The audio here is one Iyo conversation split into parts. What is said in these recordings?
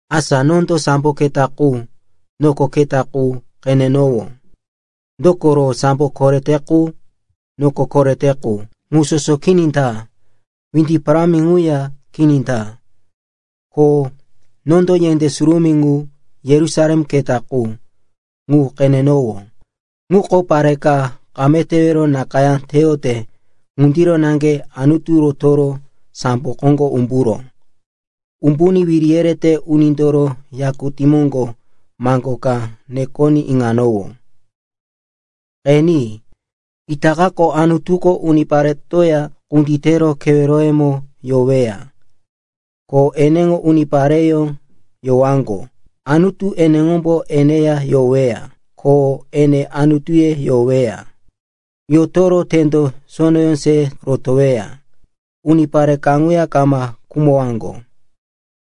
Asa nondo sambo keta qu, noko keta qu, qenenowó. Dokoro sambo korete qu, noko korete qu, ŋu soso kini ta. Windi parámi ŋuya kini ta. Ko nondo yendé surumí ŋu, Yerusalem keta qu, ŋu qenenowó. Ŋuko pare ka kame tewero nakayá teyote ŋundiro naŋge Anutu rotoro sambo koŋgo umburó. Umbuní wiri yerete unindoro yakutí moŋgo maŋgo ka nekoní iŋanowó, “Qeni. Itakako Anutuko uniparetoya kunditero keweroyemo yoweya, ko eneŋo unipareyó yowaŋgo. Anutu eneŋombo eneya yoweya, ko ene Anutuye yoweya. Yotoro tendo sonoyó se rotoweya. Unipare kaŋuya kama khumowaŋgo,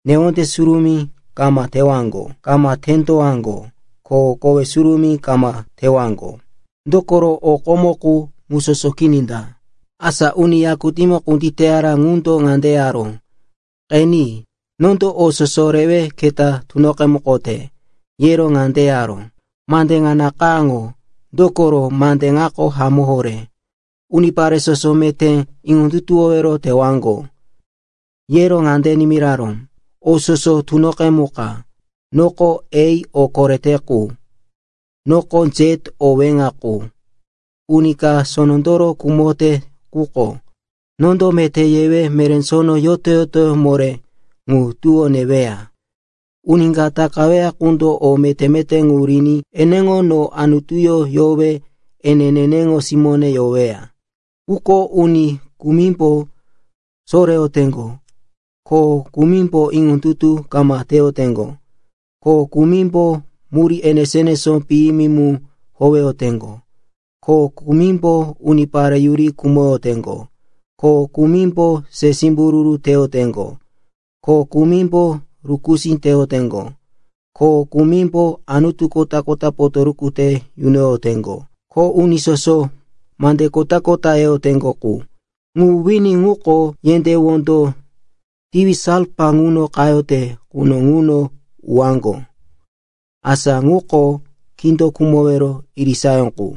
newonde surumí kama tewaŋgo, kama tendowaŋgo ko kowe surumí kama tewaŋgo. Dokoro o komo qu ŋu soso kini ta.” Asa uni yakutímo kunditeyaró ŋundo ŋande yaró, “Qeni. Nondo o soso rewe keta tunoqemukote.” Yero ŋande yaró, “Mande ŋa nakayáŋo, dokoro mande ŋako hamó horé, unipare soso meté iŋondutuwowero tewaŋgo.” Yero ŋande nimiraró, “O soso tunoqemuka! Noko A, o korete qu, noko Z, o weŋa qu. Uni ka sonondoro khumote quko, nondo meté yewe meré sono yoto-yotoyó moré ŋu tuwó neweya. Uni ka takaweya qundo o meté-meté ŋu riní eneŋo no Anutuyó yowe ene neneŋo simóne yoweya. Quko uni kumimbo soreyoteŋgo, ko kumimbo iŋondutu kama teyoteŋgo, ko kumimbo murí enesó-enesó piyimi mu howeyoteŋgo, ko kumimbo unipare yuri khumoyoteŋgo, ko kumimbo se simbururu teyoteŋgo, ko kumimbo rukusí teyoteŋgo, ko kumimbo anutu kota-kota potoruku te yunoyoteŋgo, ko uni soso mande kota-kota yeyoteŋgo qu, ŋu wini ŋuko yendé wondo tiwi salfa ŋuno qayote quno ŋuno uwaŋgo. Asa ŋuko kindo khumowero irisayó qu.”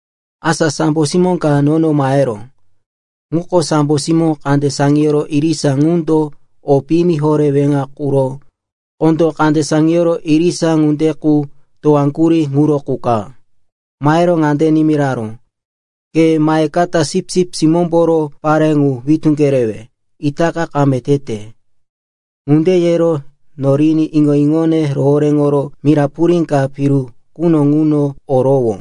Asa sambo simó ka nono maheró. Ŋuko sambo simó kande saŋiyoro irisa ŋundo o piyimi horé weŋa quro kondó kande saŋiyoro irisa ŋunde qu towaŋgurí ŋuro qu ka. Mahero ŋande nimiraró, “Ke mahekata Sipsip Simómboro parí ŋu witú kerewe, itaka kame tete.” Ŋunde yero noriní iŋo-iŋone rohoréŋoro mira purí ka piru quno ŋuno orowó.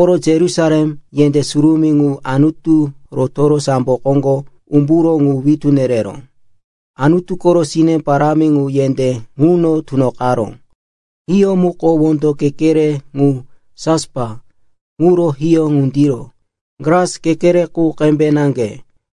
Oro Yerusalem, yendé surumí ŋu Anutu rotoro sambo koŋgo umburó ŋu witú nereró. Anutu koro sine parámi ŋu yendé ŋuno tunoqaró. Hiyó muko wondo kekere ŋu jaspa ŋuro hiyó ŋundiro, glas kekere qu qembe naŋge.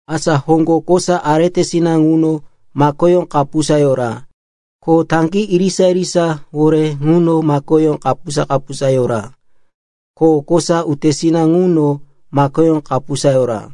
Asa hoŋgo kosa aretesina ŋuno makoyó kapusa yora. Ko taŋgí irisa-irisawore ŋuno makoyó kapusa-kapusa yora. Ko kosa utesina ŋuno makoyó kapusa yora.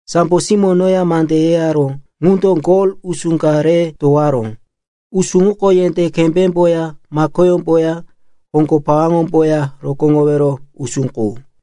Sambo simó noya mande yeyaró ŋundo gol usú ka re towaró. Usú ŋuko yendé kembémboya makoyómboya hoŋgo pawaŋomboya rokóŋowero usú qu.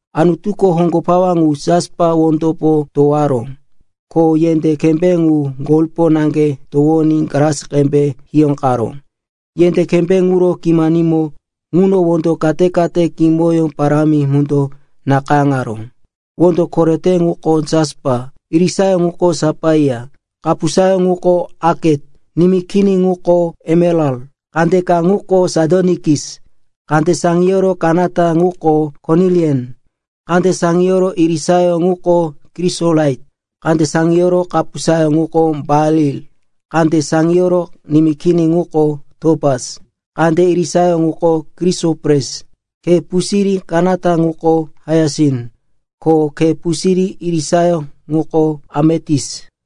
Anutuko hoŋgo pawa ŋu jaspa wondopo towaró, ko yendé kembé ŋu golpo naŋge towoní glas qembe hiyóqaró. Yendé kembé ŋuro kimanimo ŋuno wondo kate-kate kimoyó parámi mundo nakayáŋaró. Wondo korete ŋuko jaspa, irisayó ŋuko sapaia, kapusayó ŋuko aket, nimí kini ŋuko emeral, kandeka ŋuko sadonikis, kande saŋiyoro kanata ŋuko konilian, kande saŋiyoro irisayó ŋuko krisolait, kande saŋiyoro kapusayó ŋuko baril, kande saŋiyoro nimí kini ŋuko topas, kande irisayó ŋuko krisopres, khe pusirí kanata ŋuko haiasin, ko khe pusirí irisayó ŋuko ametis.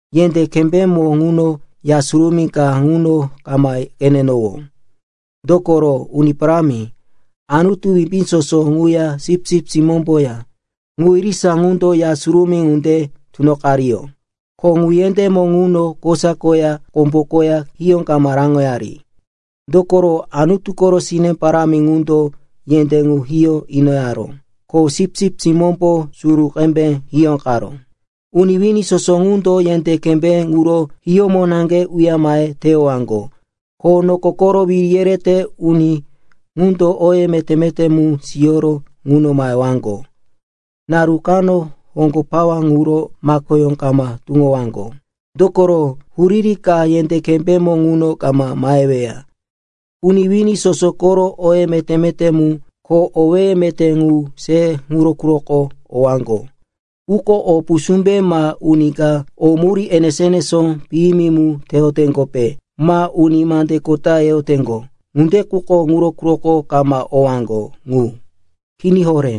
Yendé kembémo ŋuno Ya Surumí ka ŋuno kama qenenowó. Dokoro Uni Parámi, Anutu Wimbí Soso ŋuya Sipsip Simómboya, ŋu irisa ŋundo Ya Surumí ŋunde tunoqariyó. Ko ŋu yendémo ŋuno kosa koya kombo koya hiyó kama raŋoyari. Dokoro Anutu koro sine parámi ŋundo yendé ŋu hiyó inoyaró, ko Sipsip Simómbo suru qembe hiyóqaró. Uni wini soso ŋundo yendé kembé ŋuro hiyómo naŋge uya mahe teyowaŋgo. Ko noko koro wiri yerete uni ŋundo oye meté-meté mu siyoro ŋuno mahewaŋgo. Naru kano hoŋgo pawa ŋuro makoyó kama tuŋowaŋgo, dokoro huriri ka yendé kembémo ŋuno kama maheweya. Uni wini soso koro oye meté-meté mu ko owéye meté ŋu se ŋuro quroko owaŋgo. Quko o pusúmbe ma uni ka o murí enesó-enesó piyimi mu teyoteŋgope ma uni mande kota yeyoteŋgo, ŋunde quko ŋuro quroko kama owaŋgo ŋu. Kini horé.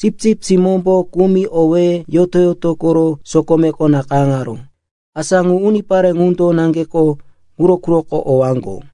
Sipsip Simómbo kumi owéye yoto-yoto koro sokomeko nakayáŋaró, asa ŋu unipare ŋundo naŋgeko ŋuro quroko owaŋgo.